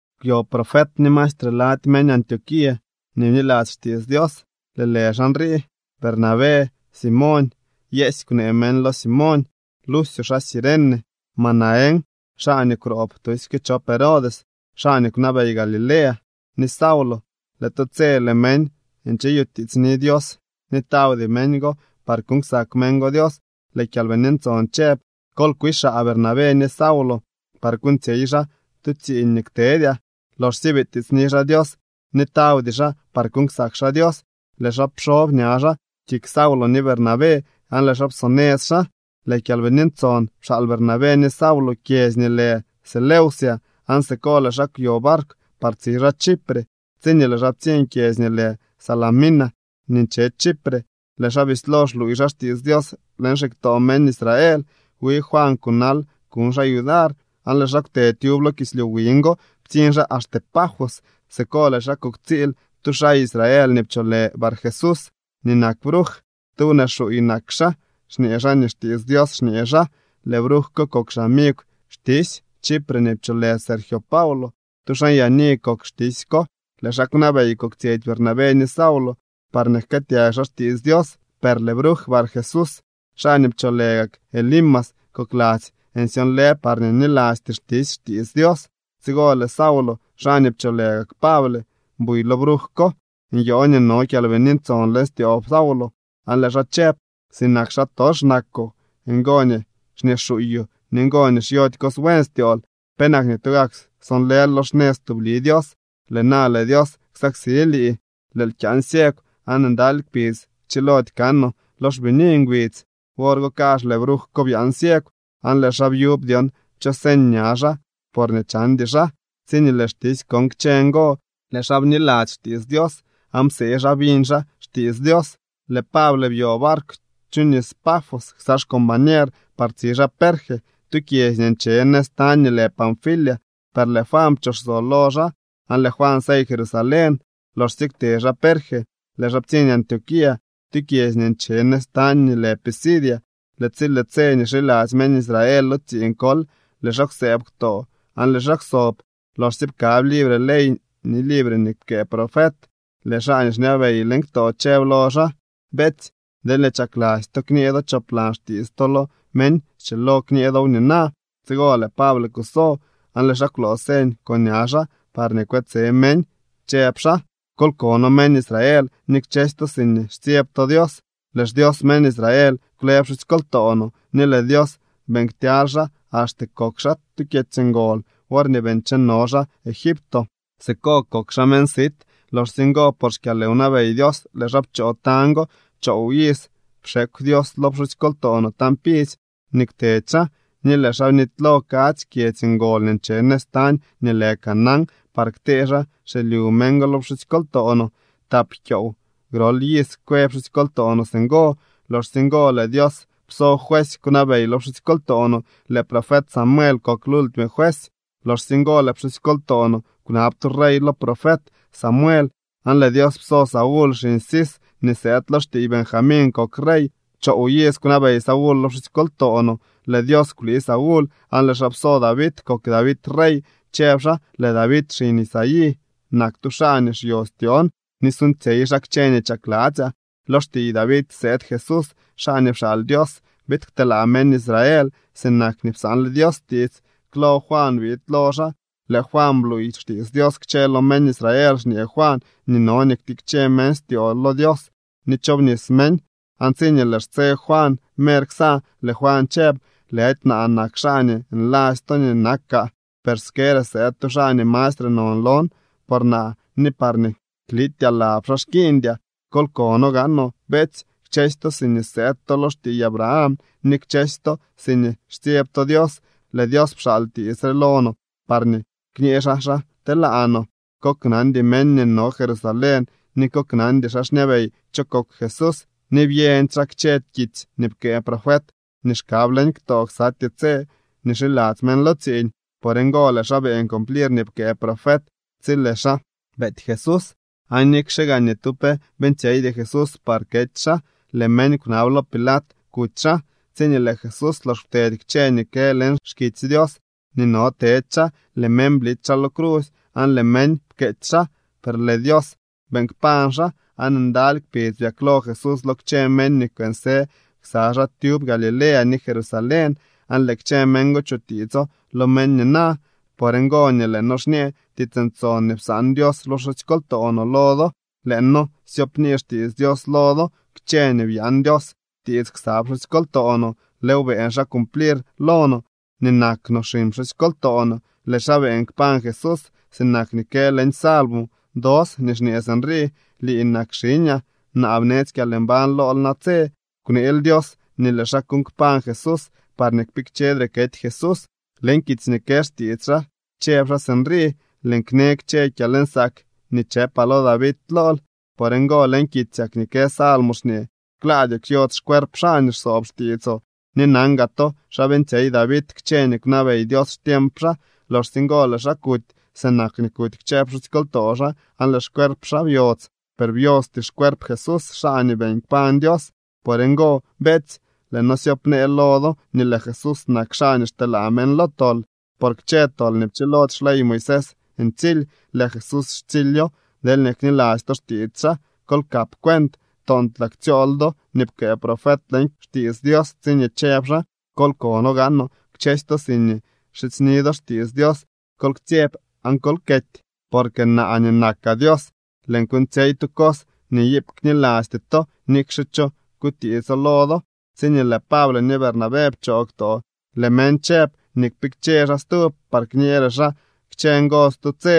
Kwyo profet ni maestre lady meñ Antioquía nii bniladzy xtiits Dios. Lëë lë xaa nrii: Bernabé, Simoñ (Yeesy kwnee meñ lo Simoñ), Lucio xaa Cirene, Manaén (xaa nii kwroob tusyke chop Herodes, xaa nii kwnabey Galilea) ni Saulo. Lëë tu tse, lëë meñ ncheyutiitsni Dios ni tawdy meñ go par kuuñ ksak meñ go Dios. Lëë Kyalbini Ntson chëb: —Kol kwixaa Bernabé ni Saulo par kuuñtsyey xaa tu tsiiñ nii ktedyaa. Loxsye bitiitsni xaa Dios ni tawdy xaa par kuuñ ksak xaa Dios, lëë xaa pxob ña xaa kik Saulo ni Bernabé aan lëë xaa psonëz xaa. Lëë Kyalbini Ntson pxaal Bernabé ni Saulo kyedzy nii lë Seleucia aan siko lëë xaa kwyo barkw par tsi xaa Chipre. Tsiñee lëë xaa ptsiñ kyedzy nii lë Salamina nii nche Chipre, lëë xaa bislo xluuy xaa xtiits Dios leñ xiktoo meñ Israel. Wi Juan kunal kuñ xaa yudar. Aan lëë xaa kwte tyub lo kislyu wiñ go ptsiñ xaa axte Pafos. Siko lëë xaa kuktsiil tu xaa Israel nii pcholë Barjesús nii nak bruj. Tu wnee xuuy nak xaa, xñee xaa nii xtiits Dios xñee xaa. Lëë bruj ko kok xamigw xtisy Chipre nii pcholë Sergio Paulo. Tu xaa nyaani kok xtisy ko, lëë xaa kwnabey koktsyetsy Bernabé ni Saulo, parñee jkëëtyag xaa xtiits Dios. Per lëë bruj Barjesús, xaa nii pcholë gak Elimas, kokladzy nsyonlë parñee nilasty xtisy xtiits Dios. Tsigo lëë Saulo, xaa nii pcholë gak Pable, buy lo bruj ko, nyoo nii no Kyalbini Ntson leñ styoo Saulo, aan lëë xaa chëb: —¡Sinak xaatox nakoo! ¡Ngo nii xñee xuuyoo ni ngo nii xyody cos buen styool! ¿Penak nii tugak sonlël lo xnëz tubli Dios? Lëë na lëë Dios ksaksi lii. Lëël kyaan ciegw aan ndaly kpidz kchilody kanoo lo xbini ngbidz. Wor go kazh lëë bruj ko byaan ciegw, aan lëë xaa byub dyon cho señ ña xaa porñee chandy xaa. Tsiñee lëë xtisy kon kchë ngo, lëë xaa bniladzy xtiits Dios, aan psee xaa biñ xaa xtiits Dios. Lëë Pable byo barkw chu nis Pafos ksa xcombañer par tsi xaa Perge, tu kyedzy nii nche nëz tañ nii lë Panfilia. Per lëë Juan pchoxso lo xaa, aan lëë Juan sey Jerusalén. Loxsye kwte xaa Perge, lëë xaa ptsiñ Antioquía, tu kyedzy nii nche nëz tañ nii lë Pisidia. Lëë tsi lëë tse nii xiladzy meñ Israel lo tsiiñ kol, lëë xaa kwsëëb ktoo aan lëë xaa kwsob. Loxsye pkab libre ley ni libre nii pkëë profet, lëë xaa nii xñabey leñ ktoo chëb lo xaa: —Beetsy, deelñee chakladzy to kñee do choplan xtiits to lo meñ, schilo kñee dow nina. Tsigo lëë Pable kuso, aan lëë xaa kwloo señ con ña xaa parñee kwetse meñ, chëb xaa: —Kol kono, meñ Israel, ni kchësy to siñee xtsyeb to Dios: Lëë xDios meñ Israel kwle pxusykoltoo no ni lëë Dios beeñ ktyaly xaa axte kok xaa tu kyedzy ngol worñee bii ncheno xaa Egipto. Siko kok xaa meñ sit. Loxsye ngo por xkyalwnabey Dios lëë xaa pchoo tañ go. Choow iz pxekw Dios lo pxusykoltoo no tañ pidzy nii kwtedy xaa, ni lëë xaa bnitylo kadzy kyedzy ngol nii nche nëz tañ nii lë Canaán par ktee xaa xilyu meñ go lo pxusykoltoo no. Tap kyoow grol iz kwë pxusykoltoo no singo. Loxsye ngo lëë Dios pso juesy kwnabey lo pxusykoltoo no. Lëë profet Samuel kok lultime juesy. ’Loxsye ngo lëë pxusykoltoo no kwnab tu rey lo profet Samuel, aan lëë Dios pso Saúl xiñ Cis nii sëëd lo xtiiy Benjamín kok rey. Choow iz kwnabey Saúl lo pxusykoltoo no. Lëë Dios kwlii Saúl, aan lëë xaa pso David kok David rey, chëb xaa: “Lëë David xiñ Isaí nak tu xaa nii xyo styoon ni suuñtsyey xaa kchë nii chakladzyaa.” Lo xtiiy David sëëd Jesús, xaa nii pxaal Dios biid kteelaa meñ Israel, sinak nii psaanle Dios tiits. Klo Juan biid lo xaa. Lëë Juan bluuy xtiits Dios kchë lo meñ Israel, xñee Juan nii no nii ktikche meñ styoo lo Dios ni chobnis meñ. Aan tsiñee lëë xtse Juan mer ksa, lëë Juan chëb: “Lëdy naa nak xaa nii nladzy to nii nakaa. Per skere sëëd tu xaa nii mastre non lon, por naa ni parñee kliityaa lab xaa xkiiñdyaa.” ’Kol kono gaanoo, beetsy, kchësy to siñee sëëd to lo xtiiy Abraham ni kchësy to siñee xtsyeb to Dios. Lëë Dios pxaal tiits re lo no parñee kñë xaa xa telaa no. Koknandy meñ nii no Jerusalén ni koknandy xaa xñabey cho kok Jesús. Ni byeñdy xaa kchë kitsy nii pkëë profet nii xkab leñ ktoo ksatyee tse nii xiladzy meñ lo tsiiñ. Por ngo lëë xaa beeñ cumplir nii pkëë profet tsi lëë xaa beety Jesús. Aan nikxe gaa ni tu pe beeñtsyeydy Jesús par kety xaa, lëë meñ kwnab lo Pilat kuty xaa. Tsiñee lëë Jesús lox kwtedy kchë nii kë leñ xkitsy Dios nii no tedy xaa, lëë meñ blity xaa lo crusy aan lëë meñ pkeetsy xaa. Per lëë Dios beeñ kpañ xaa. Aan ndaly kpidz byaklo Jesús lo kchë meñ nii kwënsë ksa xaa tyub Galilea ni Jerusalén, aan lëë kchë meñ go chutiitso lo meñ nina. ’Por ngo nii lëë noo xñee tiits ntson nii psaan Dios lo pxusykoltoo no lo do. Lëë noo syoopnii xtiits Dios lo do. Kchë nii byaan Dios tiits ksa pxusykoltoo no, lëëw beeñ xaa cumplir lo no nii nak no xiñ pxusykoltoo no. Lëë xaa beeñ kpañ Jesús sinak nii kë leñ salmo dos nii xñee sinrii: “Lii nak xiñaa. Naa bnetsy kyalmbañ lool natse.” Kwneel Dios nii lëë xaa kuuñ kpañ Jesús parñee kpikchedre kety Jesús. Leñ kitsy nii kë xtiits xaa chëb xaa sinrii: “Lëën kne kchë kyalnsaak nii chëpaa lo David lool.” Por ngo leñ kitsyak nii kë salmos xñee: “Klaadyoo kyodz xcuerp xaa nii xsoob xtiitsoo.” Ni nan gaa to xa beeñtsyey David kchë nii kwnabey Dios xtiemp xaa. Loxsye ngo lëë xaa kuty sinak nii kuty kchë pxusykoltoo xaa aan lëë xcuerp xaa byodz. Per byosty xcuerp Jesús, xaa nii beeñ kpañ Dios. Por ngo, beetsy, lëë noo syoopnee lo do nii lëë Jesús nak xaa nii xteelaa meñ lo tol. Por kchë tol nii pchilody xley Moisés ntsily, lëë Jesús xtsilyo, deelñee kniladzy to xtiits xaa. Kol kap cuent, toontlaa ktsyool do nii pkëë profet leñ xkitsy Dios tsiñee chëb xaa: Kol kono gaanoo kchësy to siñee xidzyni do xtiits Dios, kol ktsyeb aan kol kety, porque naa nii nakaa Dios, lëën kuuñtsyey tu cos nii iip knilasty to, nikxe cho kutiitso lo do. Tsiñee lëë Pable ni Bernabé pchoo ktoo, lëë meñ chëb nii kpikche xaa stub par kñeere xaa kchë ngo stu tse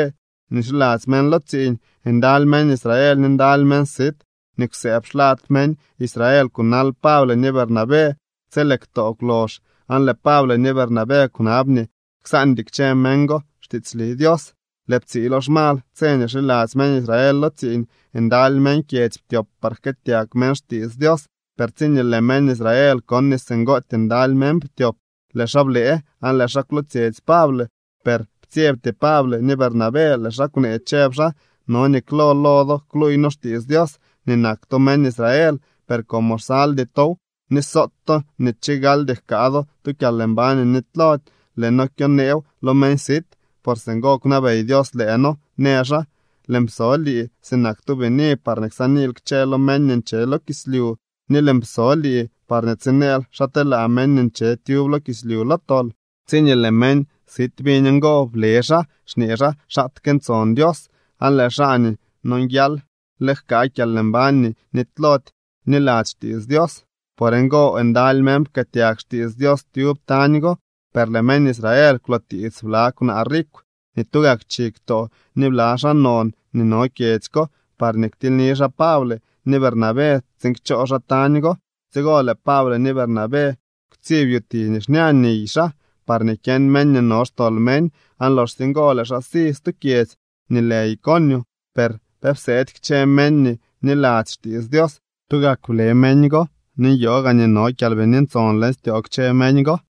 nii xiladzy meñ lo tsiiñ. Ndaly meñ Israel ni ndaly meñ sit nii kwsëëb xlad meñ Israel kunal Pable ni Bernabé tsi lëë ktoo kwlox. Aan lëë Pable ni Bernabé kwnab nii ksaandy kchë meñ go xtiitsli Dios. Lëë ptsiilo xmal, tse nii xiladzy meñ Israel lo tsiiñ, ndaly meñ kyedzy ptyop par jkëëtyag meñ xtiits Dios. Per tsiñee lëë meñ Israel kon nii singootyee ndaly meñ ptyop, lëë xaa blëë aan lëë xaa kwlootsyetsy Pable. Per ptsyebty Pable ni Bernabé. Lëë xaa kwnee, chëb xaa: —No nii klo lo do kluuy noo xtiits Dios nii nak to meñ Israel, per como xsaldy tow, ni soot to nii chigaldy jkaa do tu kyalmbañ nii nitylody, lëë noo kyoneew lo meñ sit. Por singo kwnabey Dios lëë noo, në xaa: Lëën pso lii sinak tu bini, parñee ksaaniil kchë lo meñ nii nche lo kislyu, ni lëën pso lii parñee tsineel xa telaa meñ nii nche tyub lo kislyu lo tol. Tsiñee lëë meñ sit biñ ngo, ble xaa, xñee xaa xaatke ntson Dios, aan lëë xaa nii nonguial le jkaa kyalmbañ nii nitylody bniladzy xtiits Dios. Por ngo ndaly meñ pkëëtyag xtiits Dios tyub tañ go. Per lëë meñ Israel kwlootiits bla kwnaa rikw nii tugak chi ktoo ni bla xaa non nii no kyedzy ko parñee ktilyni xaa Pable ni Bernabé tsiin kchoo xaa tañ go. Tsigo lëë Pable ni Bernabé kwtsib yuti nii xña niy xaa parñee kyeñ meñ nii no xtol meñ, aan loxsye ngo lëë xaa si stu kyedzy nii lë Iconio. Per pe pseedy kchë meñ nii bniladzy xtiits Dios. Tugak ble meñ go ni nyoo gaa nii no Kyalbini Ntson leñ styoo kchë meñ go.